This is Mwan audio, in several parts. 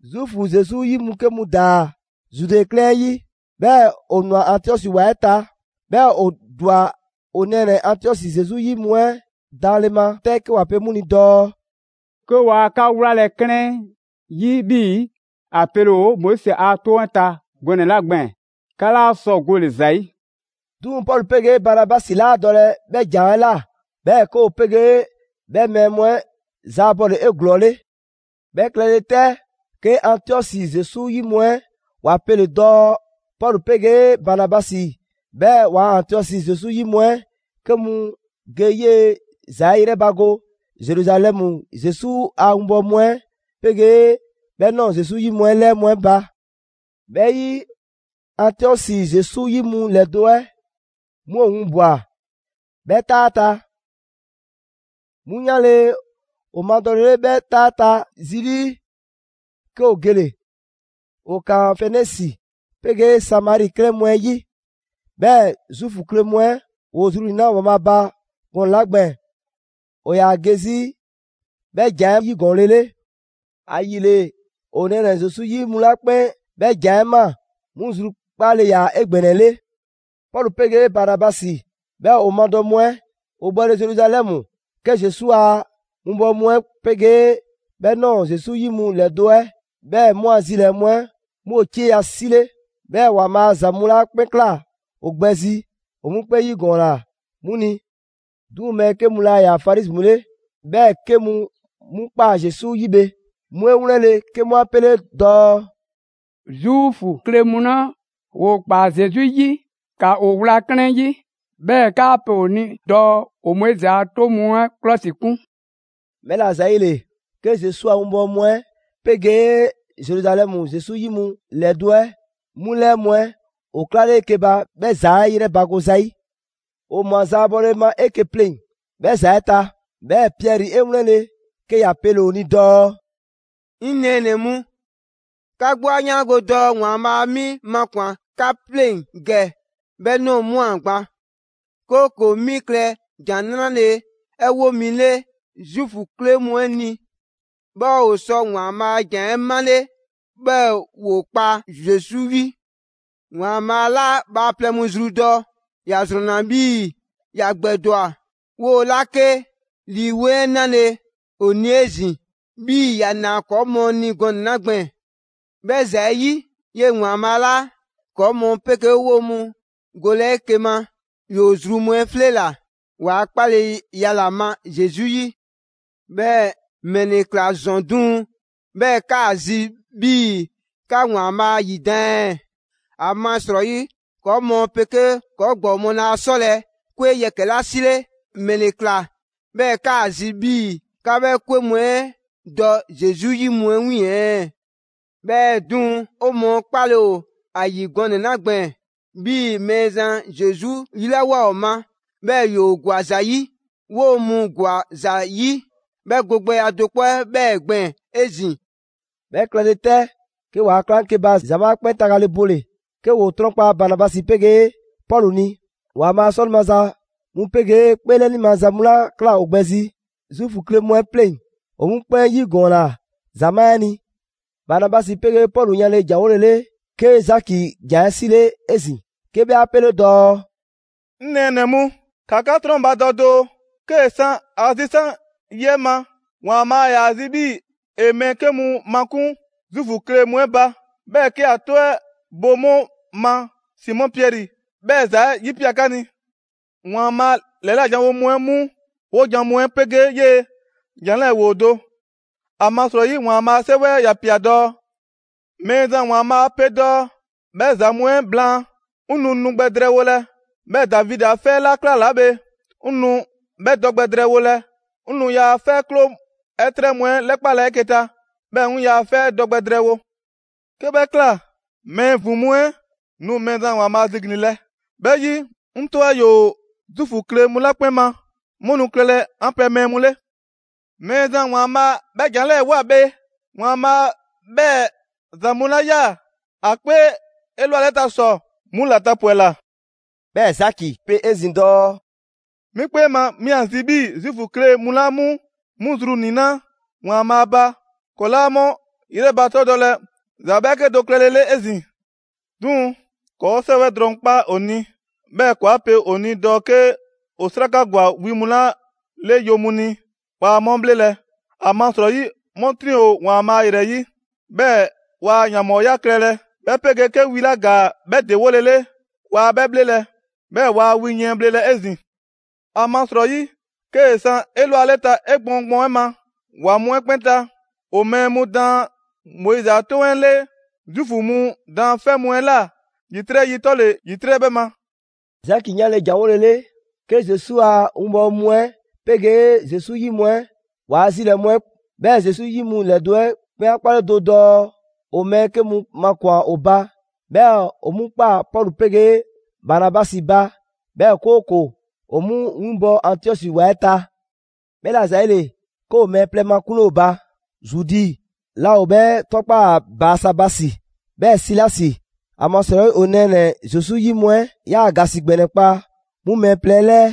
Zuufu Zesu 'yi mu 'ke mu ‑daa Zude 'klɛɛn 'ɛ 'yi, 'bhɛɛ‑ ‑o ‑nwa Antiɔsi ‑wa 'ɛ ta. 'Bhɛɛ‑ ‑o ‑dwa 'o nɛɛnɛ‑ Antiɔsi Zesu 'yi mu 'ɛ daanle ma 'tɛ 'ke ‑wa pe 'mu ni dɔɔ: «'Ke waa 'ka 'wlalɛ‑ 'klɛɛn 'yi 'bhii‑ ‑a pele ‑o Moizi a 'toŋ 'ɛ ta gɔnɛ‑ 'la gbɛɛn‑, 'ka 'laa sɔ gole‑ ‑za 'yi.» 'Duŋ‑ Pɔlu 'pegee Banabasi 'laa dɔlɛ 'bhɛ ‑jan 'ɛ ꞊la; 'bhɛɛ‑ 'ke ‑o 'pegee 'bhɛ mɛɛ mu 'ɛ zaabɔle 'eglɔɔle. 'Bhɛ klɛle 'tɛ, 'ke Antiɔsi Zesu 'yi mu 'ɛ ‑wa pele‑ dɔɔ Pɔlu 'pegee Banabasi, 'bhɛɛ‑ ‑waa' Antiɔsi Zesu 'yi mu 'ɛ 'ke mu ge 'yee‑ ‑za 'ɛ 'yrɛbago Zeruzalɛmu Zesu a 'winbɔwo mu 'ɛ 'pegee 'bhɛ ꞊nɔɔ Zesu 'yi mu 'ɛ 'lɛɛ mu 'ɛ ba. 'Bhɛ 'yi, Antiɔsi Zesu 'yi mu ‑lɛdo' 'ɛ 'mu ‑o winbwa‑ 'bhɛ 'taa 'ɛ ta. 'Mu 'yanle‑ ‑o madɔlele 'bhɛ 'taa 'ɛ ta zi 'lii, 'ke ‑o gele‑. ‑O ‑kaan Fenisi 'pegee Samari 'klɛɛn mu 'ɛ 'yi. 'Bhɛɛ‑ Zuufu kle mu 'ɛ ‑woo zru ‑niinaa' ‑Waanbhaa' ba gɔnɛ‑ 'la gbɛɛn‑ ‑o ‑yaa ge 'zi 'bhɛ ‑jan 'ɛ 'yigɔɔnlele. ‑Ayile ‑o nɛɛnɛ‑ Zesu 'yi mu 'la 'kpɛn 'bhɛ ‑jan 'ɛ ꞊maa 'mu zrukpaale ‑yaa 'egbɛnɛle. Pɔlu 'pegee Banabasi, 'bhɛɛ‑ ‑o madɔ mu 'ɛ ‑o 'bhɔle‑ Zeruzalɛmu, 'ke Zesu a winbɔwo mu 'ɛ 'pegee 'bhɛ ꞊nɔɔ Zesu 'yi mu ‑lɛdo' 'ɛ, 'bhɛɛ‑ 'mu a zilɛɛ‑ mu 'ɛ 'mu ‑o 'cieya‑ 'sile. 'Bhɛɛ‑ ‑Waanbhaa' ‑za mu 'la 'kpɛn ꞊kla ‑o gbɛ zi, ‑o 'mu 'kpɛn 'yigɔɔnna 'mu ni. 'Duŋ‑ mɛɛ 'kɛ mu 'la 'yaa‑ Farizi mu 'le, 'bhɛɛ‑ 'ke mu 'mu ꞊kpaa Zesu 'yi bhe, 'mu 'e ‑wlɛnle' 'ke 'mu 'a 'pele dɔɔ: «Zuufu kle mu 'la ‑woo ꞊kpaa Zesu 'yi, ‑ka ‑o 'wla 'klɛɛn 'yi, 'bhɛɛ‑ ‑kaa pe ‑o ni dɔɔ ‑o Moizi a 'toŋ mu 'ɛ 'klɔsikun.» 'Bhɛla‑ ‑zayile, 'ke Zesu a 'winbɔwo mu 'ɛ 'pegee Zeruzalɛmu Zesu 'yi mu ‑lɛdo' 'ɛ 'mu 'lɛɛ mu 'ɛ ‑o 'klale 'eke‑ ba 'bhɛ ‑za 'ɛ 'yrɛbago zayi'. ‑O ꞊mwa zaabɔle ma 'eke‑ pleŋ‑ 'bhɛ ‑za 'ɛ ta. 'Bhɛɛ‑ Piɛri 'e 'wlɛnle‑ 'ke ‑ya pele‑ ‑o ni dɔɔ: «'Ŋ nɛɛnɛ‑ mu, 'ka 'gbu 'a 'yaango‑ dɔɔ ‑Waanbhaa' 'mi makwan‑ 'ka 'pleŋ‑ ‑gɛ 'bhɛ ꞊nɔɔ ꞊mwa gban, 'kooko‑ 'mi klɛ ‑Jan 'Nrale‑ 'ɛ 'wo mi 'le Zuufu kle mu 'ɛ ni, 'bhɛɛ‑ ‑o sɔ ‑Waanbhaa' a ‑Jan 'ɛ 'male, 'bhɛɛ‑ ‑woo kpa Zesu 'yi. ‑Waanbhaa' 'la bhaaplɛŋ mu zru dɔ, ‑ya ‑zrɔnna 'bhii‑ ‑ya gbɛdwa‑ ‑o ꞊la 'kee‑ Lii 'Weŋ 'ɛ 'nale ‑o ni 'ezin‑ 'bhii‑ ‑ya ꞊naa ‑kɔɔ' mu ni gɔnɛ‑ 'la gbɛɛn‑. 'Bhɛ ‑za 'ɛ 'yi, 'yee‑ ‑Waanbhaa' laa ‑kɔɔ' mu 'pegee 'woo‑ mu golɛ 'eke‑ ma. ‑Yoo zru mu 'ɛ 'fleela‑ ‑waa' 'kpaleya ‑la ma Zesu 'yi. 'Bhɛɛ‑ ‑mɛle ‑kla ‑zɔn 'duŋ‑ 'bhɛɛ‑ 'kaa‑ zi 'bhii‑ 'ka ‑Waanbhaa' ‑yidan' ɛɛ? ‑Amasrɔyi ‑kɔɔ' mu 'pegee ‑kɔɔ' ‑gbɔɔ mu laa 'sɔlɛ‑ 'kwe yɛkɛ‑ 'la 'sile, ‑mɛle ꞊kla 'bhɛɛ‑ 'kaa‑ zi 'bhii‑ 'ka 'bhɛ 'kwe mu 'ɛ dɔ Zesu 'yi mu 'ɛ 'wiiŋ‑ ɛɛ? 'Bhɛɛ‑ 'duŋ‑, 'o mɔɔ 'kpale‑ ‑o ‑a ‑yi gɔnɛ‑ 'la gbɛɛn‑ 'bhii‑ Mɛɛzan Zesu 'lilawoa 'o ma 'bhɛɛ‑ ‑yoo' ‑gwa ‑za 'yi, 'woo‑ mu ‑gwa ‑za 'yi 'bhɛ go gbɛya do 'kpɔ 'ɛ 'bhɛɛ‑ gbɛɛn‑ 'ezin‑.» 'Bhɛ klɛle 'tɛ, 'ke ‑waa' 'klaŋkeba ‑zamaa' 'ɛ 'kpɛn tagale bole‑, 'ke ‑woo 'trɔnkpa Banabasi 'pegee Pɔlu ni. ‑Waanbhaa' 'sɔle‑ maza mu 'pegee 'kpeelɛni maza mu 'la ꞊kla ‑o gbɛ zi Zuufu kle mu 'ɛ 'pleŋ, ‑o 'mu 'kpɛn 'yigɔɔnna ‑zamaa' 'ɛ ni. Banabasi 'pegee Pɔlu 'yanle ‑janwolele, 'ke Zaki ‑jan 'ɛ 'sile 'ezin‑ 'ke 'bhɛ 'a 'pele dɔɔ: «'Ŋ nɛɛnɛ‑ mu, ‑ka 'ka 'trɔnbadɔ doo! 'Kee‑ 'san ‑a zisan' yi 'ɛ ma, ‑Waanbhaa' ‑yaa zi 'bhii‑ ‑e mɛɛ 'ke mu makun Zuufu kle mu 'ɛ ba, 'bhɛɛ‑ 'ke ‑a 'tɔ 'ɛ bo 'mu ma Simɔ Piɛri 'bhɛɛ‑ ‑za 'ɛ 'yipia꞊ 'ka ni. ‑Waanbhaa' ‑lɛla' janwo mu 'ɛ 'mu 'wojan‑ mu 'ɛ 'pegee 'yee‑ ‑jan 'lɛɛ ‑woo do. ‑Amasrɔyi ‑Waanbhaa' a 'Sɛwɛ 'ɛ ‑ya ꞊pia dɔɔ: ‹Mɛɛzan ‑Waanbhaa' pe dɔɔ 'bhɛ ‑za mu 'ɛ blaan, 'ŋ nu nu gbɛ drɛɛwolɛ, 'bhɛɛ‑ Davidi 'a 'fɛ 'la 'klalaa bhe, 'ŋ nu 'bhɛ dɔ gbɛ drɛɛwolɛ. 'Ŋ nu ‑yaa' 'fɛ kloo 'ɛ 'trɛ mu 'ɛ 'lɛkpalɛ 'eke‑ ta, 'bhɛɛ‑ 'ŋ ‑yaa' 'fɛ dɔ gbɛ drɛɛwo. 'Ke 'bhɛ ꞊kla, mɛɛ ‑vin mu 'ɛ nu Mɛɛzan ‑Waanbhaa' ziglinlɛ, 'bhɛ 'yi, 'ŋ 'tɔ 'ɛ ‑yoo Zuufu kle mu 'la 'kpɛn ma, 'mu nu klɛlɛ 'an pɛ mɛɛ mu 'le. Mɛɛzan ‑Waanbhaa' 'bhɛɛ‑ ‑jan 'lɛɛ‑ ꞊woa bhe. ‑Waanbhaa' 'bhɛɛ‑ ‑za mu 'la 'yaa‑ ‑a 'kpee 'elwaleta ‑sɔ, 'mu ‑la tapwɛla.›» 'Bhɛɛ‑ Zaki pe 'ezin‑ dɔɔ: «'Mi 'kpee ma, 'mi ‑a zi 'bhii‑ Zuufu kle mu 'la 'mu 'mu zru ‑niinaa' ‑Waanbhaa' ba, ‑kɔɔ' 'laa 'mu ‑yrɛbatɛdɔlɛ ‑za 'bhɛɛke do klɛlele 'ezin‑. 'Duŋ‑ ‑kɔɔ' 'sɛwɛ drɔŋ 'kpa ‑o ni, 'bhɛɛ‑ ‑kɔɔ' 'a 'pe ‑o ni dɔɔ 'ke ‑o 'sraka ‑gwa wi mu 'la 'le yo mu ni, waa 'mu 'bhlelɛ‑, ‑amasrɔyi 'mu 'triŋ‑ ‑o ‑Waanbhaa' ‑yrɛ 'yi; 'bhɛɛ‑ waa ‑yanbhɔɔya klɛlɛ, 'bhɛ 'pegee 'ke wi 'la ‑gaa 'bhɛ ‑dewolele, waa 'bhɛ 'bhlelɛ‑, 'bhɛɛ‑ waa wi yiɛn bhlelɛ 'ezin‑. ‑Amasrɔyi 'kee‑ san 'elwaleta 'egbɔɔn gbɔɔn 'ɛ ma, ‑wa mu 'ɛ 'kpɛn ta, ‑o mɛɛ mu daan Moizi a 'Toŋ 'ɛ 'le Zuufu mu daanfɛ' mu 'ɛ ꞊la ‑yitrɛ' yi 'tɔle‑ ‑yitrɛ' 'bhɛ ma.» Zaki 'yanle‑ ‑janwolele, 'ke Zesu a 'winbɔwo mu 'ɛ 'pegee Zesu 'yi mu 'ɛ ‑waa' zilɛɛ‑ mu 'ɛ, 'bhɛɛ‑ Zesu 'yi mu ‑lɛdo' 'ɛ 'kpɛn 'a 'kpale do dɔɔ ‑o mɛɛ 'ke mu makun' ‑o ba, 'bhɛɛ‑ ‑o 'mu 'kpa Pɔlu 'pegee Banabasi ba, 'bhɛɛ‑ 'kooko‑ ‑o 'mu 'winbɔ‑ Antiɔsi ‑wa 'ɛ ta. 'Bhɛla‑ ‑zayile, 'ke ‑o mɛɛ plɛ makunle ‑o ba: Zudi 'la ‑o 'bhɛ 'tɔkpaa‑ Baasabasi, 'bhɛɛ‑ Silasi, ‑amasrɔyi ‑o nɛɛnɛ‑ Zesu 'yi mu 'ɛ 'yaa‑ ‑gasi ‑gbɛnɛ kpa 'mu mɛɛ plɛ 'ɛ 'lɛɛ.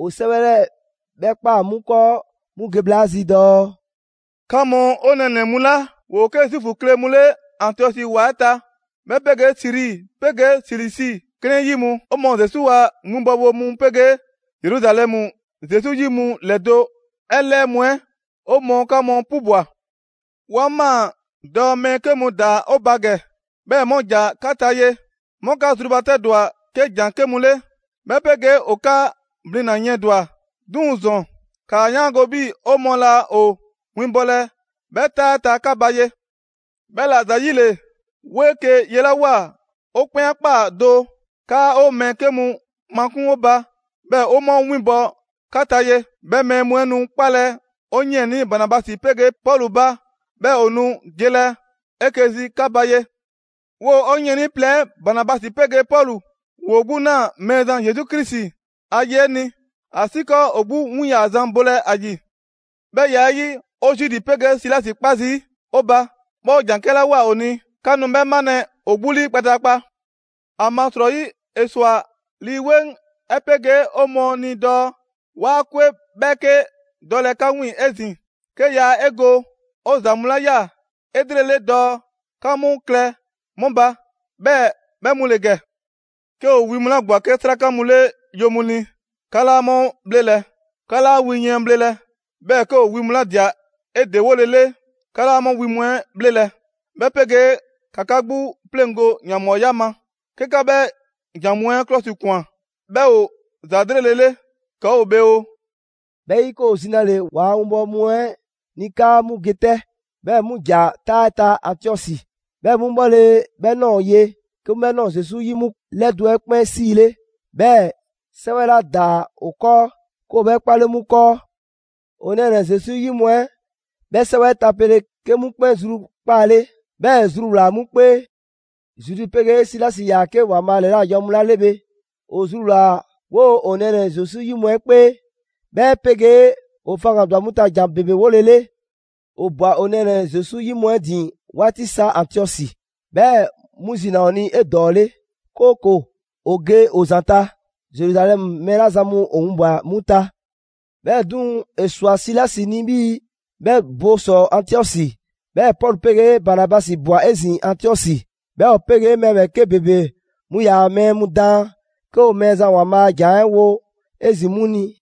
‑O 'sɛwɛ 'lɛɛ‑ 'bhɛɛ‑ ꞊kpaa 'mu 'kɔɔ 'mu ge bhla 'ɛ zi dɔɔ: «'Ka mu 'o nɛɛnɛ‑ mu 'la ‑woo 'ke Zuufu kle mu 'le Antiɔsi ‑wa 'ɛ ta, 'bhɛ 'pegee Siri 'pegee Silisi 'klɛɛn 'yi mu, 'o mɔɔ Zesu a winbɔwo mu 'pegee Zeruzalɛmu Zesu 'yi mu ‑lɛdo' 'ɛ 'lɛɛ mu 'ɛ, 'o mɔɔ 'ka mu 'pubwa‑! «'Wa ꞊maa dɔɔ mɛɛ 'ke mu ‑daa 'o ba ‑gɛ, 'bhɛɛ‑ 'mu ‑ja 'ka ta ye, 'mu 'ka zrubatɛdwa 'ke ‑jan 'ke mu 'le, 'bhɛ 'pegee ‑o 'ka blina‑ yiɛndwa‑. 'Duŋ‑ ‑zɔn, ‑kaa 'yaango‑ 'bhii‑ 'o mɔɔ laa ‑o 'winbɔlɛ 'bhɛ 'taa 'ɛ ta 'ka ba ye. 'Bhɛla‑ ‑zayile, 'woo 'eke‑ yelawoa 'o 'kpɛn 'a ꞊kpaa do 'kaa 'o mɛɛ 'ke mu makun' 'o ba, 'bhɛɛ‑ 'o 'mu winbɔ 'ka ta ye. 'Bhɛ mɛɛ mu 'ɛ nu 'kpalɛ‑ 'o 'yiɛnii Banabasi 'pegee Pɔlu ba, 'bhɛɛ‑ ‑o nu gelɛ 'eke‑ zi 'ka ba ye. 'Woo‑ 'o 'yiɛnii plɛ 'ɛ Banabasi 'pegee Pɔlu, ‑woo 'gbu ꞊naa Mɛɛzan Zesu Krisi a ye 'ɛ ni, ‑asiikɔɔ ‑o 'gbu win ‑yaa zan bolɛ ‑a ‑yi. 'Bhɛ ya 'ɛ 'yi, 'o Zudi 'pegee Silasi 'kpa zii' ‑o ba, 'bhɛɛ‑ 'o ‑jan 'kɛla ꞊woa ‑o ni, 'ka nu 'bhɛ 'malɛ‑ ‑o 'gbu 'lii kpataakpa. ‑Amasrɔyi ‑e ꞊swa Lii 'Weŋ 'ɛ 'pegee 'o mɔɔ ni dɔɔ 'waa 'kwe 'bhɛɛke dɔlɛ 'ka 'wiiŋ‑ 'ezin‑, 'ke ‑yaa 'e go 'o ‑za mu 'la ꞊ya 'elrele dɔɔ 'ka 'mu klɛ mu ba, 'bhɛɛ‑ 'bhɛ mu ‑le ‑gɛ: 'Ke ‑o wi mu 'la ‑gwa 'ke 'sraka mu 'le yo mu ni, 'ka 'laa 'mu 'bhlelɛ‑; 'ka 'laa wi yiɛn bhlelɛ; 'bhɛɛ‑ 'ke ‑o wi mu 'la ‑dia 'e ‑dewolele, 'ka 'laa 'mu wi mu 'ɛ bhlelɛ, 'bhɛ 'pegee ‑ka 'ka 'gbu 'pleŋgo‑ ‑yanbhɔɔya ma. 'Ke 'ka 'bhɛ ‑jan mu 'ɛ 'klɔsikwan, 'bhɛ ‑o ‑za 'lrele‑ 'le! ‑Kɔɔ' ‑o bhe oo!» 'Bhɛ 'yi, 'ke ‑o zinale ‑waa' winbɔwo mu 'ɛ ni 'kaa 'mu ge 'tɛ; 'bhɛɛ‑ 'mu ‑ja 'taa 'ɛ ta Antiɔsi. 'Bhɛ mu bhɔle 'bhɛ ꞊nɔɔ ye, 'ke 'mu 'bhɛ ꞊nɔɔ Zesu 'yi mu ‑lɛdo' 'ɛ 'kpɛn 'siile, 'bhɛɛ‑ 'sɛwɛ 'la ‑daa ‑o 'kɔɔ, 'ke ‑o 'bhɛ 'kpale 'mu 'kɔɔ. ‑O nɛɛnɛ‑ Zesu 'yi mu 'ɛ 'bhɛ 'sɛwɛ 'ɛ tapele, 'kee‑ 'mu 'kpɛn zrukpaale, 'bhɛɛ‑ ‑e zruwlaa‑ 'mu 'kpee. Zudi 'pegee Silasi ‑yaa 'ke ‑Waanbhaa' ‑lɛla' janwo mu 'la 'le bhe, ‑o zruwlaa‑ 'woo‑ 'o nɛɛnɛ‑ Zesu 'yi mu 'ɛ 'kpee, 'bhɛ 'pegee ‑o faŋgandwa 'mu ta ‑jan ‑bebe 'wolele. ‑O ꞊bwa ‑o nɛɛnɛ‑ Zesu 'yi mu 'ɛ ‑din 'waati sa Antiɔsi, 'bhɛɛ‑ 'mu zi ‑naa ‑o ni 'edɔɔle, 'kooko‑ ‑o ge ‑o ‑zanta' Zeruzalɛmu mɛɛ 'la zan mu ‑o winbwa‑ 'mu ta. ['Bhɛɛ‑ 'duŋ‑, ‑e ꞊swa Silasi ni 'bhii‑ 'bhɛ bo ‑sɔ Antiɔsi.] 'Bhɛɛ‑ Pɔlu 'pegee Banabasi ꞊bwa 'ezin‑ Antiɔsi. 'Bhɛɛ‑ ‑o 'pegee mɛɛ ‑bhɛɛke' ‑bebe mu ‑yaa mɛɛ mu daan, 'ke ‑o Mɛɛzan ‑Waanbhaa' a ‑Jan 'ɛ wo 'ezin‑ 'mu ni.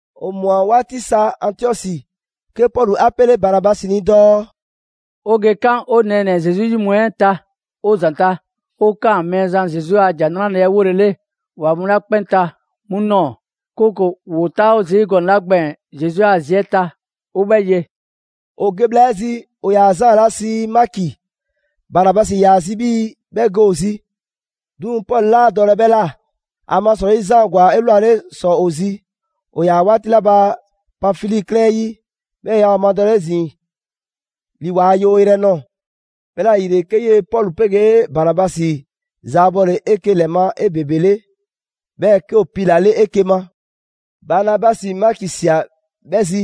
'O ꞊mwa 'waati sa Antiɔsi, 'ke Pɔlu 'a 'pele Banabasi ni dɔɔ: «'O ge 'kan 'o nɛɛnɛ‑ Zesu 'yi mu 'ɛ ta 'o ‑zanta' 'o 'kaan‑ Mɛɛzan Zesu a ‑Jan 'ɛ 'wolele ‑wa mu 'la 'kpɛn ta 'mu ꞊nɔɔ, 'kooko‑ ‑woo 'taawo zii' gɔnɛ‑ 'la gbɛɛn‑ Zesu a zi 'ɛ ta, 'o 'bhɛ ye.» ‑O ge bhla 'ɛ zi, ‑o ‑yaa Zaan 'la sii Maki, Banabasi ‑yaa zi 'bhii‑ 'bhɛ ge ‑o zi. 'Duŋ‑ Pɔlu 'laa dɔlɛ 'bhɛ ꞊la, ‑amasrɔyi Zaan ‑gwa 'elwale ‑sɔ ‑o zi ‑o ‑yaa 'waati 'la ba Panfili 'klɛɛn 'ɛ 'yi; 'bhɛɛ‑ yaa ‑o madɔlɛ 'ezin‑ ‑li ‑waa' yewo yrɛ 'ɛ ꞊nɔɔ. 'Bhɛla‑ ‑yile, 'ke 'yee‑ Pɔlu 'pegee Banabasi zaabɔle 'eke‑ ‑lɛ ma 'ebebele, 'bhɛɛ‑ 'ke ‑o piilale 'eke‑ ma. Banabasi Maki ꞊sia 'bhɛ zi,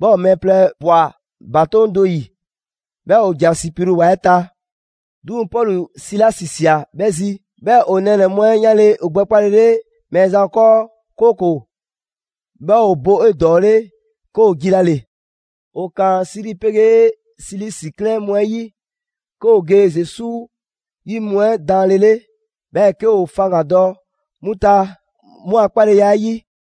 'bhɛɛ‑ ‑o mɛɛ plɛ ꞊bwa ‑batoŋ' do 'yi, 'bhɛɛ‑ ‑o ‑ja Sipru ‑wa 'ɛ ta. 'Duŋ‑ Pɔlu Silasi ꞊sia 'bhɛ zi. 'Bhɛɛ‑ ‑o nɛɛnɛ‑ mu 'ɛ 'yanle‑ ‑o gbɛkpalele Mɛɛzan 'kɔɔ, 'kooko‑ 'bhɛ ‑o bo 'edɔɔle, 'ke ‑o jilale. ‑O ‑kaan Siri pegee Silisi 'klɛɛn mu 'ɛ 'yi, 'ke ‑o ge Zesu 'yi mu 'ɛ daanlele, 'bhɛɛ‑ 'ke ‑o faŋgandɔ 'mu ta 'mu a 'kpaleya 'ɛ 'yi.